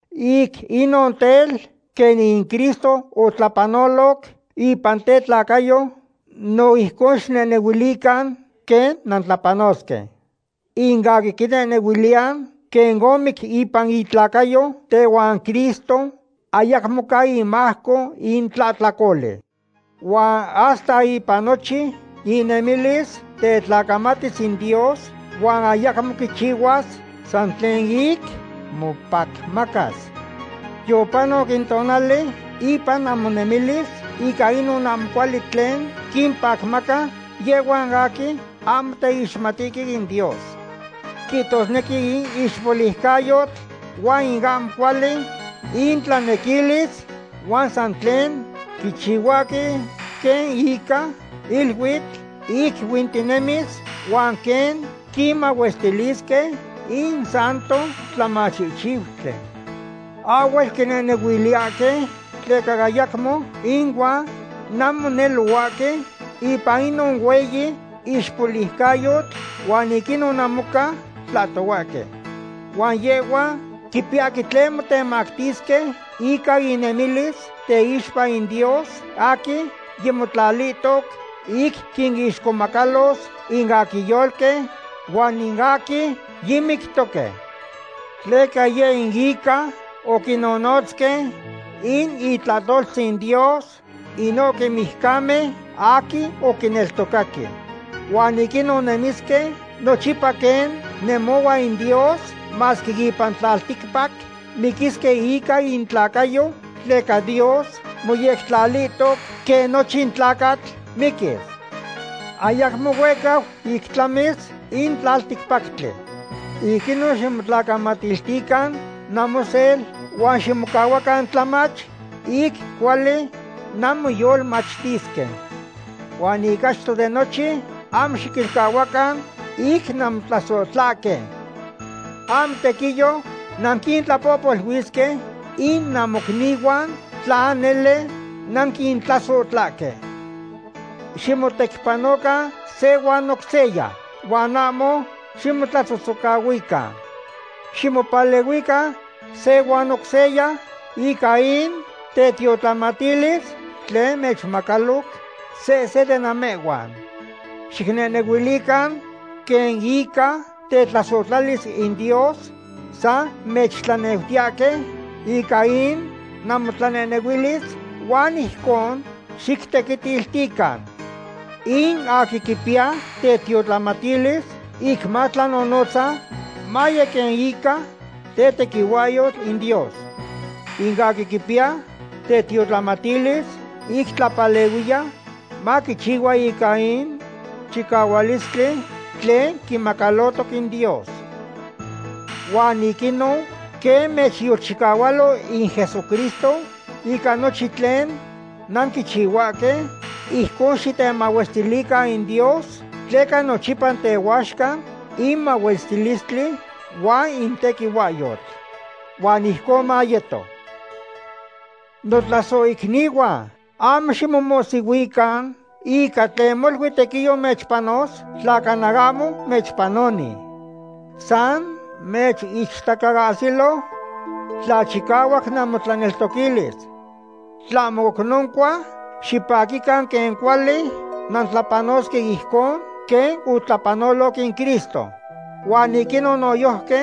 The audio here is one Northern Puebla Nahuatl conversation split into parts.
Ic inon tel, quen in Cristo otlapanoloc ipan tetlacayo, no ijcon xicnehnehuilican quen nantlapanosque. In aquin quinehnehuiliya quen omic ipan itlacayo tehuan Cristo, ayacmo ca imajco in tlahtlacoli. Huan hasta ipan nochin inemilis, tetlacamatis in Dios huan ayacmo quichihuas san tlen ic mopacmacas. Yopanoc in tonali ipan namonemilis ica inon ahmo cuali tlen quimpacmaca yehhuan aquin ahmo teixmatihque in Dios. Quihtosnequi in ixpoliucayotl huan in ahmo cuali intlanequilis, huan san tlen quichihuahque quen ica iluitl ic huintihtinemis huan quen quinmahuestilisque in santo tlamachihchiutli. Ahhuel quinehnehuiliyahque tleca ayacmo inuan nanmonelohuahque ipan inon hueyi ixpoliucayotl, huan ic inon namoca tlahtohuahque. Huan yehhuan quipiyahque tlen motemactisque ica innemilis teixpa in Dios aquin yimotlalihtoc ic quinixcomacalo in aquin yolqui huan in aquin yimictoque. Tleca yeh in ica oquinnonotzque in itlahtoltzin Dios inohque mijcamen aquin oquineltocaque. Huan ic inon nemisque nochipa quen nemohua in Dios, masque ipan tlalticpac miquisque ica intlacayo tleca Dios moyectlalihtoc quen nochin tlacatl miquis. Ayacmo huehcau ic tlamis in tlalticpactli. Ic inon ximotlacamatiltican namosel huan ximocahuacan tlamach, ic cuali nanmoyolmachtisque. Huan ic achto de nochin ahmo xiquilcahuacan ic nanmotlasohtlahque. Ahmo tequiyo nanquintlapohpoluisque in namocnihuan tla nele nanquintlasohtlahque. Ximotecpanocan se huan oc seya huan ahmo ximotlatzotzocahuican. Ximopalehuican se huan oc seya ica in tetiotlamatilis tlen mechmacaloc sehsen de namehhuan. Xicnehnehuilican quen ica tetlasohtlalis in Dios san mechtlaneutiyahque ica in namotlanehnehuilis huan ijcon xictequitiltican. In aquin quipiya tetiotlamatilis ic matlanonotza, maye quen ica tetequihuahyo in Dios. In aquin quipiya tetiotlamatilis ic tlapalehuiya, maquichihua ica in chicahualistli tlen quimacalohtoc in Dios. Huan ic inon, quen mechyolchicahualo in Jesucristo ica nochin tlen nanquichihuahque, ijcon xitemahuestilican in Dios, tleca nochipa tehuaxca in mahuestilistli huan in tequihuahyotl. Huan ijcon mayeto. Notlasohicnihuan, ahmo ximomohsihuican ica tlen molui tequiyo mechpanos, tla cana ahmo mechpanoni. San mechichtacaahsilo tla chicahuac namotlaneltoquilis. Tlahmo oc noncua, xipaquican quen cuali nantlapanosque ijcon quen otlapanoloc in Cristo. Huan ic inon noyojqui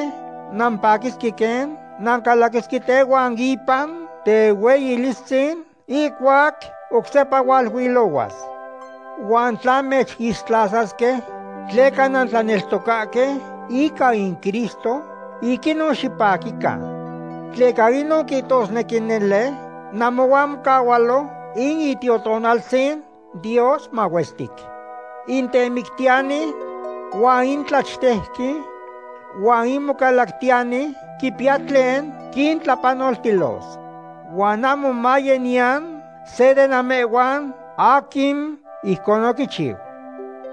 nampaquisque quen nancalaquisque tehuan ipan tehueyilistzin ihcuac oc sepa hualuilohuas. Huan tla mechixtlasasque tleca nanteneltocahque ica in Cristo, ic inon xipaquican. Tleca inon quihtosnequi nele namohuan mocahualo in Itiotonaltzin Dios mahuestic. In temictiyani huan in tlachtejqui huan in mocalactiyani quipiya tlen quintlapanoltilos. Huan ahmo maye niyan se de namehhuan aquin ijcon oquichiu.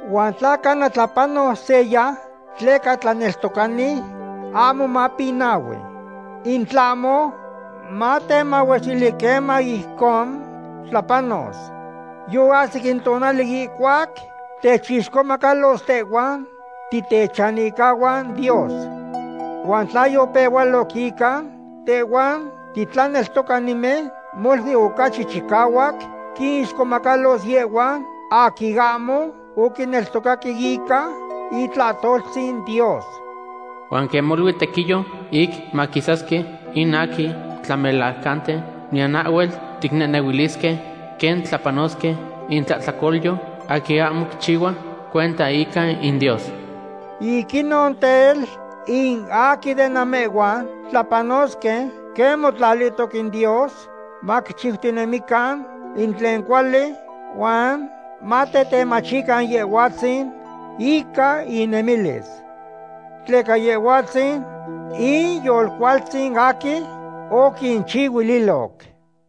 Huan tla cana tlapanos seya tleca tlaneltocani, ahmo mapinahui. In tlahmo matemahuestili queman ijcon tlapanos. Yoahsic in tonali ihcuac techixcomacalos tehhuan titechanihcahuan Dios. Huan tla yopehualoc ica tehhuan titlaneltocanimen, molui ocachi chicahuac quinixcomacalos yehhuan aquin ahmo oquineltocaque ica itlahtoltzin Dios. Huan quen molui tequiyo ic maquisasque in aquin tlamelajcanten, niyan ahhuel ticnehnehuilisque quen tlapanosque in tlahtlacolyo aquin ahmo quichihua cuenta ica in Dios. Ic inon tel, in aquin de namehhuan tlapanosque quen motlalihtoc in Dios, maquichiutinemican in tlen cuali, huan matetemachican Yehhuatzin ica inemilis. Tleca Yehhuatzin in Yolcualtzin aquin oquinchihuililoc.